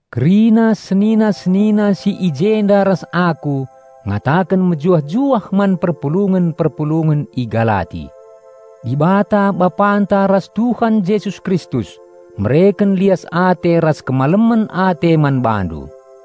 Kerina senina-senina si i jenda ras aku ngataken mejuah-juah man perpulungen-perpulungen i Galati. Dibata Bapanta ras Tuhan Jesus Kristus mereken lias ate ras kemalemen ate man bandu.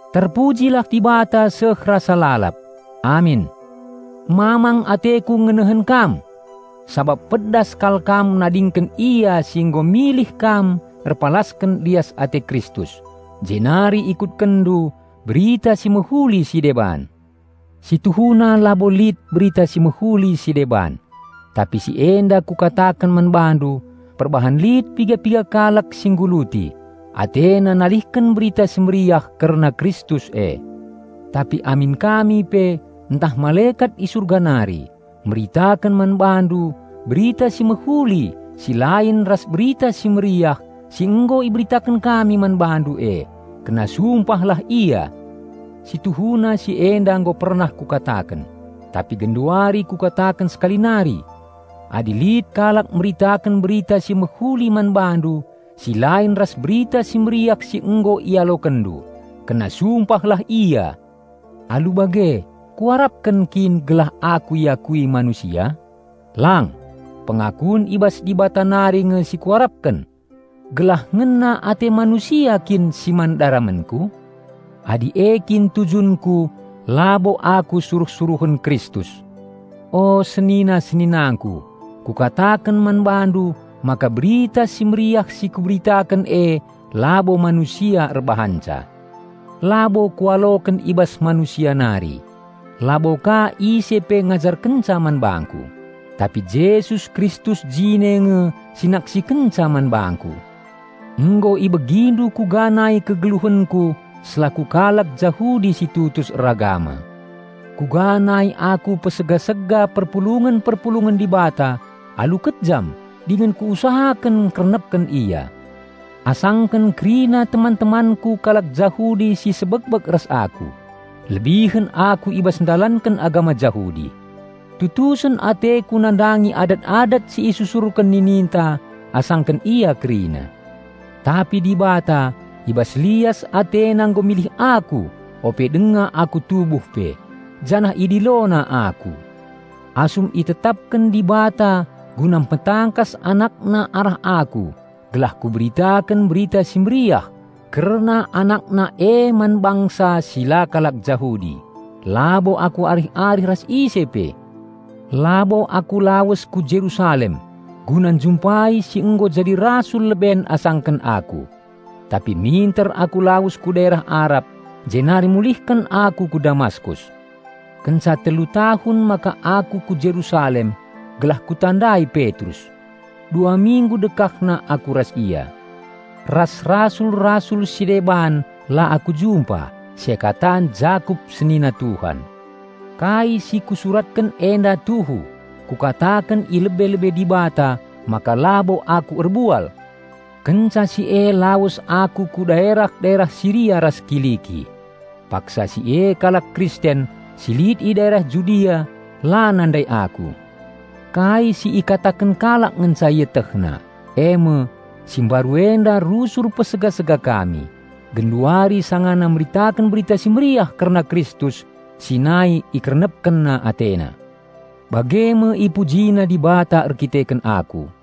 Terpujilah Dibata seh rasa lalap! Amin. Mamang ateku ngenehen kam! Sabap pedas kal kam nadingken Ia si nggo milih kam erpalasken lias ate Kristus, jenari ikutkenndu "berita si mehuli si deban". Si tuhuna labo lit "berita si mehuli si deban," tapi si enda kukataken man bandu perbahan lit piga-piga kalak si ngguluti, atena nalihken Berita Si Mehuli kerna Kristus e. Tapi amin kami pe, ntah malekat i Surga nari, meritaken man bandu berita si mehuli si lain ras Berita Si Mehuli si nggo iberitaken kami man bandu e, kena sumpahlah ia! Si tuhuna si enda nggo pernah kukataken, tapi genduari kukataken sekali nari! Adi lit kalak meritaken berita si mehuli man bandu si lain ras Berita Si Mehuli si nggo ialokenndu, kena sumpahlah ia! Alu bage, kuarapken kin gelah aku iakui manusia? Lang! Pengakun i bas Dibata nari nge si kuarapken! Gelah ngena ate manusia kin si man daramenku? Adi e kin tujunku, labo aku suruh-suruhen Kristus. O Senina-seninangku, kukataken man bandu maka Berita Si Mehuli si kuberitaken e labo manusia erbahanca. Labo kualoken i bas manusia nari; la bo ka ise pe ngajarkenca man bangku. Tapi Jesus Kristus jine nge si naksikenca man bangku. Nggo ibegindu kuga nai kegeluhenku selaku kalak Jahudi si tutus eragama, kuga nai aku niksa perpulungen-perpulungen Dibata alu kejam dingen kuusahaken ngkernepken ia. Asangken kerina teman-temanku kalak Jahudi si sebekbek ras aku, lebihen aku i bas ndalanken agama Jahudi. Tutusen ateku nandangi adat-adat si isusurken nininta asangken ia kerina. Tapi Dibata, i bas lias AteNa nggo milih aku ope denga aku tubuh pe, janah IdiloNa aku. Asum itetapken Dibata guna mpetangkas AnakNa arah aku gelah kuberitaken Berita Si Mehuli kerna AnakNa e man bangsa si la kalak Jahudi, labo aku arih-arih ras ise pe. Labo aku lawes ku Jerusalem guna njumpai si nggo jadi rasul leben asangken aku. Tapi minter aku lawes ku daerah Arab, jenari mulihken aku ku Damaskus. Kenca telu tahun maka aku ku Jerusalem gelah kutandai Petrus. Dua minggu dekahna aku ras ia. Ras rasul-rasul si deban la aku jumpa, seakatan Jakup senina Tuhan. Kai si kusuratken enda tuhu. Kukataken i lebe-lebe Dibata maka labo aku erbual! Kenca si e lawes aku ku daerah-daerah Siria ras Kiliki. Paksa si e kalak Kristen si lit i daerah Judea la nandai aku. Kai si ikataken kalak ngenca ietehna eme, "Si mbaru enda rusur niksa kami, genduari sangana meritaken Berita Si Mehuli kerna Kristus si nai ikernepken atena!" Bage me ipujina Dibata erdandanken aku.